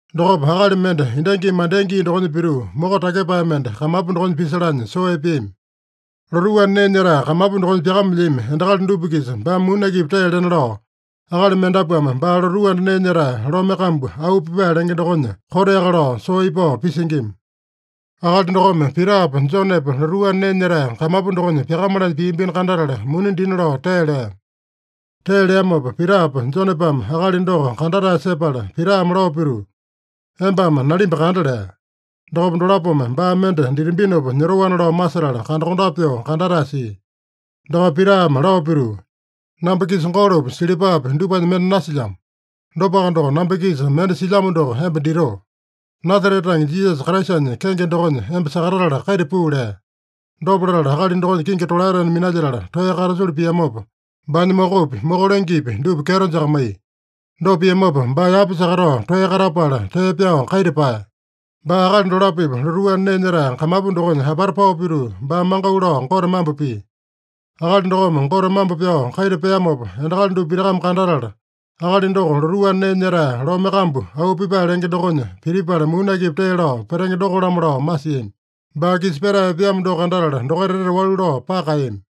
Dokopa, akali mende endangimi mandea gii dokonya pituu, moko takyepae mende kamapu dokonya pisalanya soo epeami. Lotuu anda nee nyetae kamapu dokonya pyakamelyami endakali dupa-kisa baame muni akipi tee lena lao, akali mendapuame baa lotuu anda nee nyetae lome kambu, Auu Pipae lenge dokonya koteaka lao soo ipao pisingima. Akali dokome Pitapa, Jonepa lotuu anda nee nyetae kamapu dokonya pyakamalanya piambino kandatala, muni dina lao tee lea. Tee leamopa, Pitapa Jonepame akali doko kandatae sepala, Pitame lao pituu, “Embame nalimba kanda” lea. Dokopa dolapome baa mende ditambinopa nyotoana lao masetala kandakondape pyoo kandatae sia. Dokopa Pitame lao pituu, “Namba-kisa golopi, silipapi dupanya mende nasilyamo. Dopaka doko, namba-kisa mende silyamo doko emba ditoo: Nasarete tange Jisasa Kraisanya kenge dokonya emba sakatatala kaita puu” lea. Dopa latala, akali dokonya kingi tolaetena minalyetala toeya katasulu piamopa, baanya mokopi, moko lengepi dupa kyeto jakamaiya. Dopa piamopa, baa yapa sakatao toeya katapala, tee pyao kaita paeya. Baa akali dolapo-pipa lotuu anda nee nyetae kamapu dokonya apata pao pituu, baame mangau lao Gote mambo pia. Akali dokome Gote mambo pyao kaita peamopa, endakali dupa pitakame kandatala, akali doko lotuu anda nee nyetae lome kambu, Auu Pipae lenge dokonya pitipala muni akipi tee lao petenge doko-lamo lao masiami. Baa-kisa petae epeamo doko kandatala, dokaita etete walu lao paka kaeyami.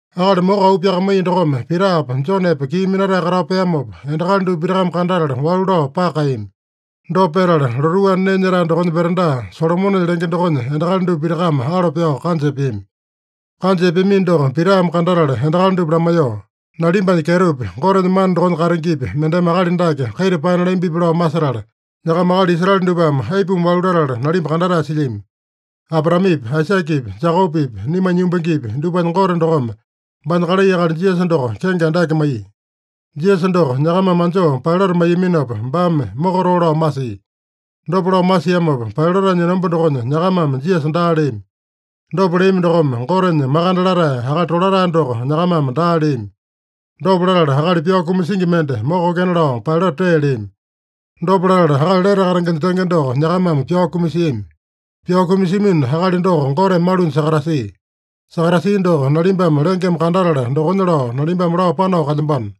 Akali moko auu pyakamaiya dokome Pitapa, Jonepa kii minatae katao peamopa, endakali dupa pitakame kandatala walu lao paka kaeyami. Dopa petala, lotuu anda nee nyetae dokonya veranda, Solomonenya lenge dokonya endakali dupa pitakame alo pyao kanja epeami. Kanja epeamino doko Pitame kandatala endakali dupa lamaiyoo, “Nalimbanya kyetopi, Gotenya mana dokonya katengepi, mendeme akali dake kaita paena lambipi lao masetala, nyakama akali Israele dupame aipuma walu latala nalimba kandatae silyami? Abraamepi, Aisakepi, Jekopepi, naimanya yumbangepi, dupanya Gote dokome baanya kalai akali Jisasa doko kenge andake maiya. Jisasa doko nyakamame anjoo Pailata maiyaminopa, baame mokatoo lao masia. Dopa lao masiamopa, Pailatanya enomba dokonya nyakamame Jisasa daa leami. Dopa leami dokome, Gotenya Makande Latae, Akali Tolatae doko nyakamame daa leami. Dopa latala, akali pyao kumasingi mende mokokena lao Pailata tee leami. Dopa latala, akali lete katengenya tenge doko nyakamame pyao kumasiami. Pyao kumasiamino akali doko Goteme malunya sakatasia. Sakatasia doko nalimbame lengeme kandatala dokonya lao, nalimbame lao panao kalyambano.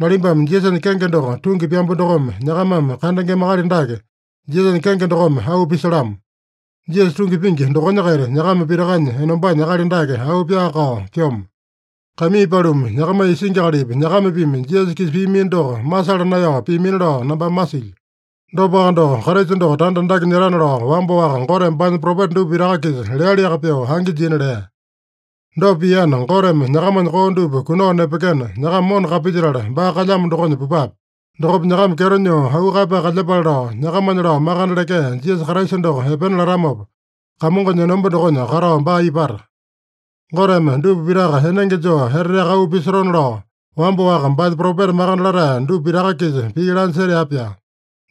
Nalimbame Jisasanya kenge doko tungi pyambu dokome, nyakamame kandengema akali dake Jisasanya kenge dokome auu pisalamo. Jisasa tungi pingi dokonya-kaita nyakama pitakanya enombanya akali dake auu pyaa-kao pyomo. “Kaimii paluma, nyakamanya isingi akalipi, nyakamapimi Jisasa-kisa piamino doko, masala naeyao piamina lao nambame masilyo. Dopaka doko, Kraisa doko tanda andake nyetana lao, wamba-waka Goteme baanya propeta dupa pitaka-kisa lealiaka pyoo angi jina lea. Dopa piana, Goteme nyakamanya koo dupa kunao nepekena, nyakama mona kapilyetala, baa kalyamo dokonya pupape. Dokopa nyakama kyeto nyoo auu kaeyapae kalyepale lao, nyakamanya lao makande lekea Jisasa Kraisa doko epena latamopa, Kamongonya enomba dokonya katao baa ipata. Goteme dupa pitaka enenge joo eteteaka auu pisotona lao, wamba-waka baanya propeta makande latae dupa pitaka-kisa pii lanya setea-pyaa.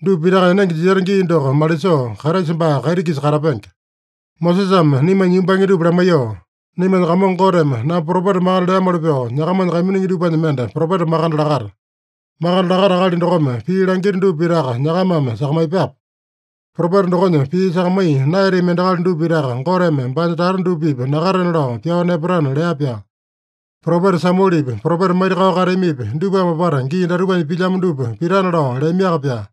Dupa pitaka enenge jiseta gii doko malisoo, Kraisa baa kaiti-kisa katapenge. Mosesame naimanya yumbange dupa lamaiyoo, ‘Naimanya Kamongo Goteme namba propeta makande leamoli pyoo, nyakamanya kaiminingi dupanya mende propeta makande lakata. Makande lakata akali dokome pii langita dupa pitaka nyakamame sakamaiyepape. Propeta dokonya pii sakamaiya naeyatami endakali dupa pitaka Goteme baanya tata dupa-pipa nakatena lao pyao nepatana’ lea-pyaa. Propeta Samuelepi, propeta maitakao kateamipi, dupame apata gii datupanya pilyamo dupa pitana lao leamiaka-pyaa.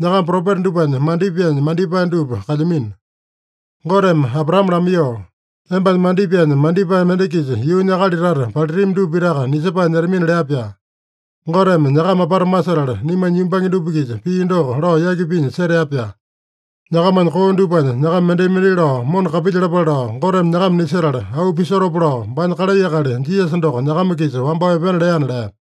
Nyakama propeta dupanya mandipaenya mandipae dupa kalyamino. Goteme Abraame lamaiyoo, ‘Embanya mandipaenya mandipae mende-kisa yuunya akali tata palitami dupa pitaka nisepae nyetamina’ lea-pyaa. Goteme nyakama apata masetala, naimanya yumbange dupa-kisa pii doko lao yaki pinya setea-pyaa. Nyakamanya koo dupanya nyakama mendai-mendai lao mona kapilyalapale lao Goteme nyakama nisetala, auu pisotopa lao baanya kalai akali Jisasa doko nyakama-kisa wambao epena leana” lea.